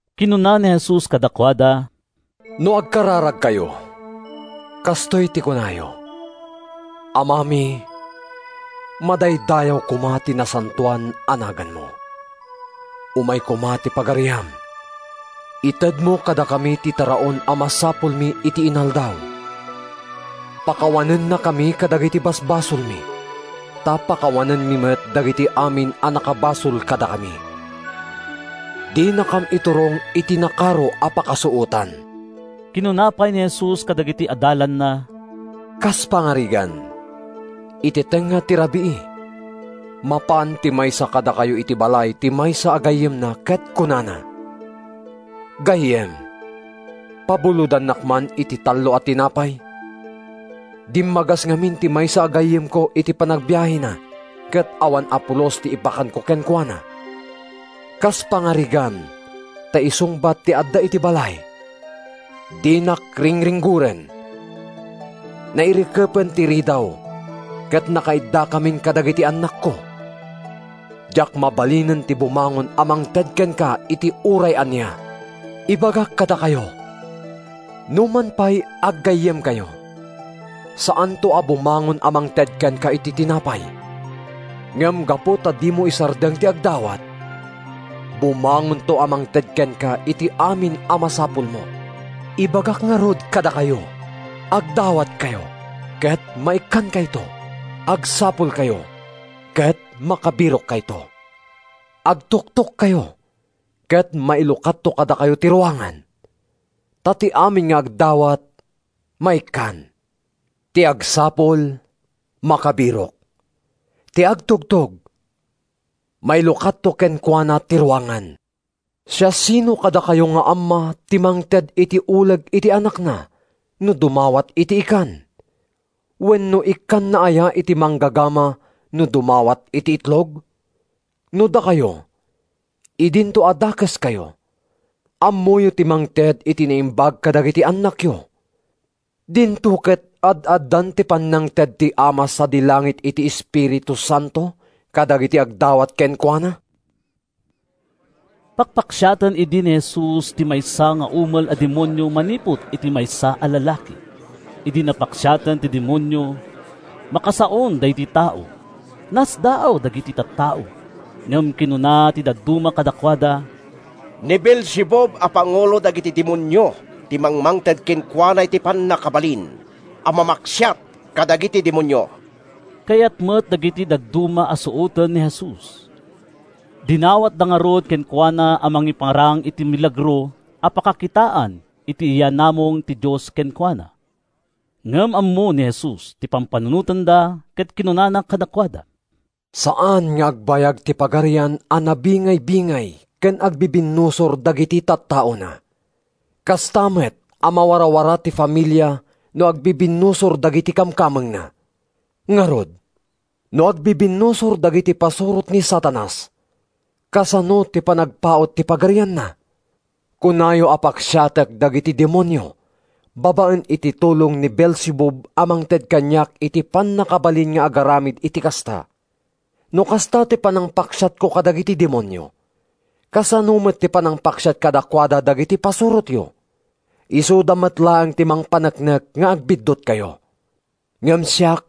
Kinuna ni Jesus kadakuada, “No agkararagkayo, kastoy ti kunayo: ‘Amami, Madaydayaw koma ti nasantoan a naganmo; Umay koma ti Pagariam. Itedmo kadakami ti taraon a masapulmi iti inaldaw. Pakawanennakami kadagiti basbasolmi, Ta pakawanenmi met dagiti amin a nakabasol kadakami. Dinakam iturong iti nakaro a pakasuotan.’” Kinuna pay ni Jesus kadagiti adalanna: “Kas pangarigan, iti tengnga ti rabii, mapan ti maysa kadakayo iti balay ti maysa a gayyemna ket kunana, ‘Gayyem, pabulodannak man iti tallo a tinapay. Dimmagas ngamin ti maysa a gayyemko iti panagbiahena ket awan a pulos ti ipakanko kenkuana.’ “Kas pangarigan ta isungbat ti adda iti balay, ‘Dinak ringringgoren! Nairikepen ti ridaw ket nakaiddakamin kadagiti annakko. Diak mabalinen ti bumangon a mangted kenka iti uray ania.’ “Ibagak kadakayo, numan pay aggayyemkayo, saanto a bumangon a mangted kenka iti tinapay. Ngem gapu ta dimo isardeng ti agdawat, bumangonto a mangted kenka iti amin a masapulmo. “Ibagak ngarud kadakayo: Agdawatkayo ket maikkankayto. Agsapulkayo ket makabirokkayto. Agtugtogkayo ket mailukatto kadakayo ti ruangan. Ta ti amin nga agdawat, maikkan. Ti agsapul, makabirok. Ti agtugtog, mailukatto kenkuana ti ruangan. “Siasino kadakayo nga amma ti mangted iti uleg iti anakna no dumawat iti ikan? Wenno ikkanna aya iti manggagama no dumawat iti itlog? No dakayo, idinto a dakeskayo, ammoyo ti mangted iti naimbag kadagiti annakyo, dinto ket ad-addan ti pannangted ti Ama sadi langit iti Espiritu Santo kadagiti agdawat kenkuana!” Pakpaksiaten idi ni Jesus ti maysa nga umel a demonio manipud iti maysa a lalaki. Idi napaksiaten ti demonio, makasaon daydi tao. Nasdaaw dagiti tattao, ngem kinuna ti dadduma kadakuada, “Ni Beelzebub a pangulo dagiti demonio ti mangmangted kenkuana iti pannakabalin a mamaksiat kadagiti demonio.” Kayat met dagiti dadduma a suoten ni Jesus. Dinawatda ngarud kenkuana a mangiparang iti milagro a pakakitaan iti yaanamong ti Dios kenkuana. Ngem ammo ni Jesus ti pampanunotenda ket kinunana kadakuada, “Saan nga agbayag ti pagarian a nabingaybingay ken agbibinnusor dagiti tattaona. Kasta met a mawarawara ti familia no agbibinnusor dagiti kamkamengna. Ngarud, no agbibinnusor dagiti pasurot ni Satanas, kasano ti panagpaut ti pagarianna? Kunayo a paksiatek dagiti demonio babaen iti tulong ni Beelzebub a mangted kaniak iti pannakabalin nga agaramid iti kasta. No kasta ti panangpaksiatko kadagiti demonio, kasano met ti panangpaksiat kadakuada dagiti pasurotyo? Isuda met laeng ti mangpaneknek nga agbiddutkayo! Ngem siak,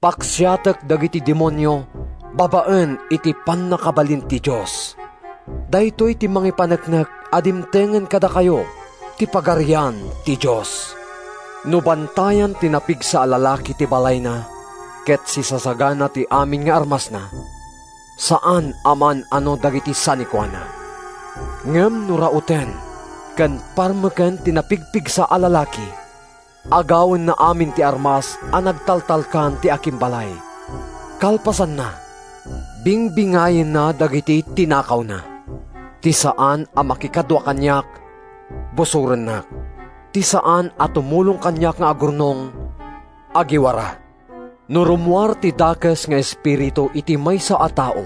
paksiatek dagiti demonio babaen iti pannakabalin ti Dios. Daytoy ti mangipaneknek a dimtengen kadakayo ti Pagarian ti Dios. “No bantayan ti napigsa a lalaki ti balayna ket sisasagana ti amin nga armasna, saan a maan-ano dagiti sanikuana. Ngem no rauten ken parmeken ti napigpigsa a lalaki, agawenna amin ti armas a nagtaltalkan ti akimbalay. Kalpasanna, bingbingayenna dagiti tinakawna. “Ti saan a makikadua kaniak, busorennak. Ti saan a tumulong kaniak nga agurnong, agiwara.” “No rummuar ti dakes nga espiritu iti maysa a tao,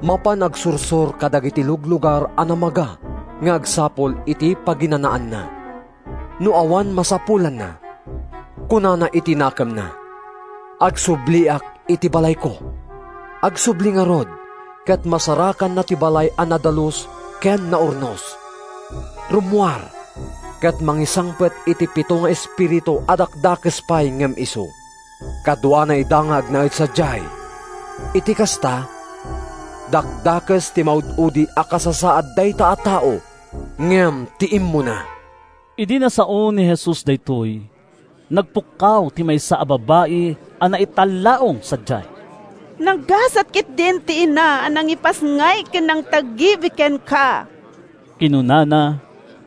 mapan agsursor kadagiti luglugar a namaga nga agsapul iti paginanaanna. No awan masapulanna, kunana iti nakemna, ‘Agsubliak iti balayko.’ Agsubli ngarud ket masarakanna ti balay a nadalus ken naurnos. Rummuar ket mangisangpet iti pito nga espiritu a dakdakes pay ngem isu. Kaduana ida nga agnaed sadiay. Iti kasta, dakdakes ti maud-udi a kasasaad dayta a tao ngem ti immuna.” Idi nasaon ni Jesus daytoy, nagpukkaw ti maysa a babai a naitallaong sadiay. “Naggasat ketdin ti ina a nangipasngay ken nangtagibi kenka!” kinunana.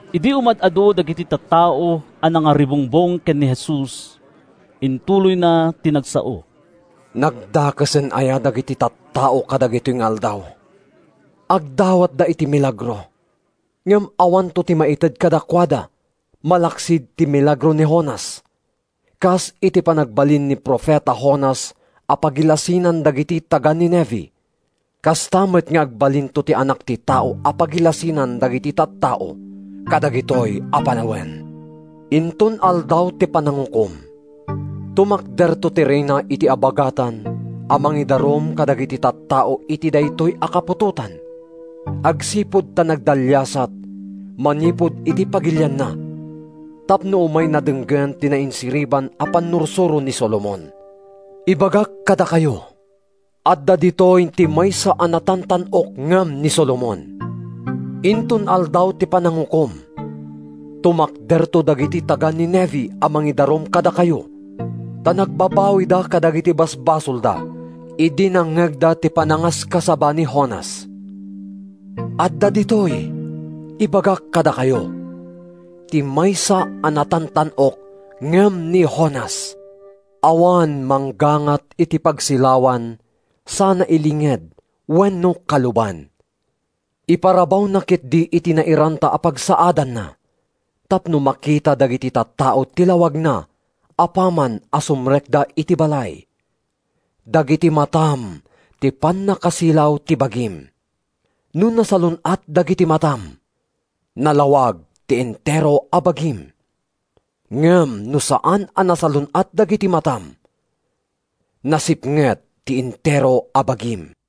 Idi umad-adu dagiti tattao a nangaribungbong ken ni Jesus, intuloyna ti nagsao: “Nagdakesen aya dagiti tattao kadagitoy nga aldaw! Agdawatda iti milagro ngem awanto ti maited kadakuada malaksid ti milagro ni Jonas. Kas iti panagbalin ni profeta Jonas a pagilasinan dagiti taga-Nineve, kasta met nga agbalinto ti Anak ti Tao a pagilasinan dagiti tattao kadagitoy a panawen. “Inton Aldaw ti Panangukom, tumakderto ti Reyna iti Abagatan a mangidarum kadagiti tattao iti daytoy a kaputotan agsipud ta nagdaliasat manipud iti pagilianna tapno umayna denggen ti nainsiriban a pannursuro ni Solomon. Ibagak kadakayo, adda ditoy ti maysa a natantan-ok ngem ni Solomon. Inton Aldaw ti Panangukom, tumakderto dagiti taga-Nineve a mangidarum kadakayo, ta nagbabawida kadagiti basbasolda idi nangngegda ti panangaskasaba ni Jonas. Adda ditoy, ibagak kadakayo, ti maysa a natantan-ok ngem ni Jonas!” “Awan manggangat iti pagsilawan sana ilinged wenno kaluban. Iparabawna ketdi iti nairanta a pagsaadanna tapno makita dagiti tattao ti lawagna apaman a sumrekda iti balay. “Dagiti matam ti pannakasilaw ti bagim. No nasalun-at dagiti matam, nalawag ti entero a bagim. Ngem no saan a nasalun-at dagiti matam, nasipnget ti entero a bagim.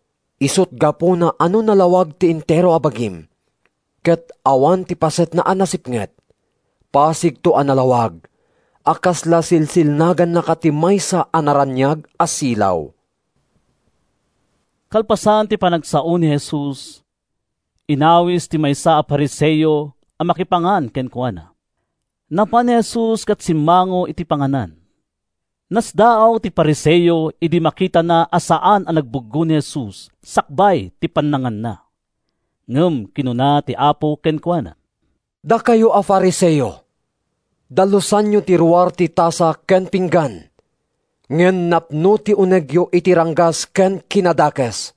Isut’ gapuna a no nalawag ti entero a bagim, ket awan ti pasetna a nasipnget, pasigto a nalawag a kasla silsilnagannaka ti maysa a naraniag a silaw.” Kalpasan ti panagsao ni Jesus, inawis ti maysa a Fariseo a makipangan kenkuana. Napan ni Jesus ket simmango iti panganan. Nasdaaw ti Fariseo idi makitana a saan a nagbuggo ni Jesus sakbay ti pannanganna. Ngem kinuna ti Apo kenkuana, “Dakayo a Fariseo, dalusanyo ti ruar ti tasa ken pinggan, ngem napno ti unegyo iti ranggas ken kinadakes.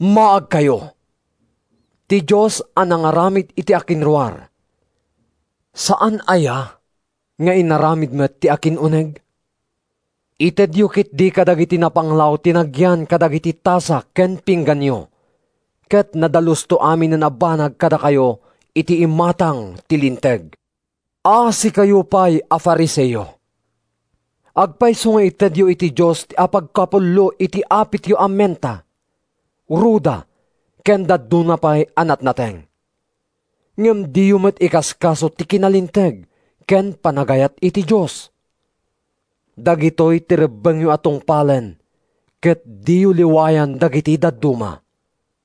Maagkayo! Ti Dios a nangaramid iti akinruar, saanna aya nga inaramid met ti akin-uneg? Itedyo ketdi kadagiti napanglaw ti nagyan kadagiti tasa ken pingganyo, ket nadalusto aminen a banag kadakayo iti imatang ti linteg. “Asikayo pay a Fariseo! Agpayso nga itedyo iti Dios ti apagkapullo ti apityo a menta, ruda ken dadduma pay a natnateng. Ngem diyo met ikaskaso ti kinalinteg ken panagayat iti Dios. Dagitoy ti rebbengyo a tungpalen ket diyo liwayan dagiti dadduma.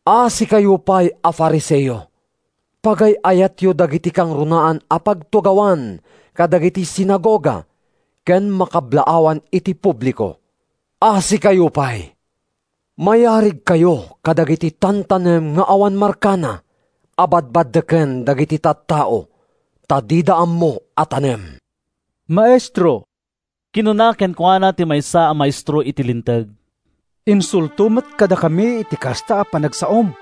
“Asikayo pay a Fariseo! Pagay-ayatyo dagiti kangrunaan a pagtugawan kadagiti sinagoga ken makablaawan iti publiko. Asikayo pay! Mayarigkayo kadagiti tantanem nga awan markana a badbaddeken dagiti tattao ta dida ammo a tanem.” “Maestro,” kinuna kenkuana ti maysa a maestro iti Linteg, “insulto met kadakami ti kasta a panagsaom!”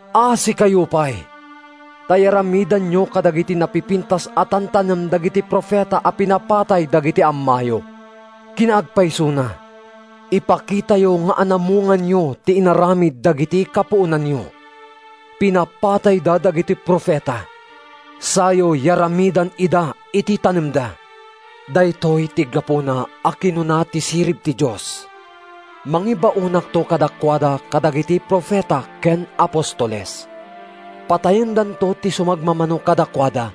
Asikayo pay! Ta yaramidanyo kadagiti napipintas a tantanem dagiti profeta a pinapatay dagidi ammayo. Kinaagpaysona, ipakitayo nga anamonganyo ti inaramid dagidi kapuonanyo: pinapatayda dagiti profeta sayo yaramidan ida iti tanemda. “Daytoy ti gapuna a kinuna ti Sirib ti Dios, ‘Mangibaonakto kadakuada kadagiti profeta ken apostoles. Patayendanto ti sumagmamano kadakuada,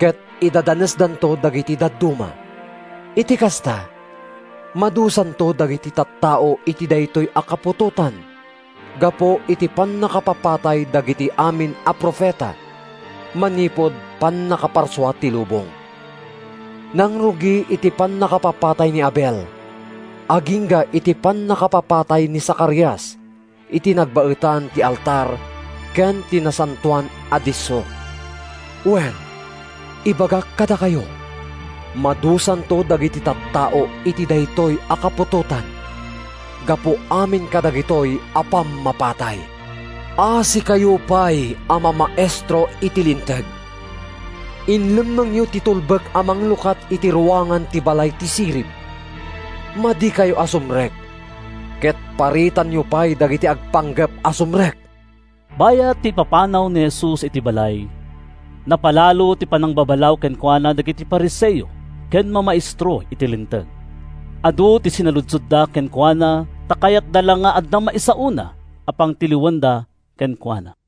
ket idadanesdanto dagiti dadduma.’ “Iti kasta, madusanto dagiti tattao iti daytoy a kaputotan gapu iti pannakapapatay dagiti amin a profeta, manipud pannakaparsua ti lubong. Nangrugi iti pannakapapatay ni Abel agingga iti pannakapapatay ni Zacarias iti nagbaetan ti altar ken ti Nasantoan a Disso. Wen, ibagak kadakayo, madusanto dagiti tattao iti daytoy a kaputotan gapu amin kadagitoy a pammapatay. “Asikayo pay a mamaestro iti Linteg! Inlemmengyo ti tulbek a manglukat iti ruangan ti balay ti sirib. Madikayo a sumrek ket paritanyo pay dagiti agpanggep a sumrek!” Bayat ti ipapanaw ni Jesus iti balay, napalalo ti panangbabalaw kenkuana dagiti Fariseo ken mamaestro iti Linteg. Adu ti sinaludsodda kenkuana ta kayatda la nga adda maisaona a pangtiliwanda kenkuana.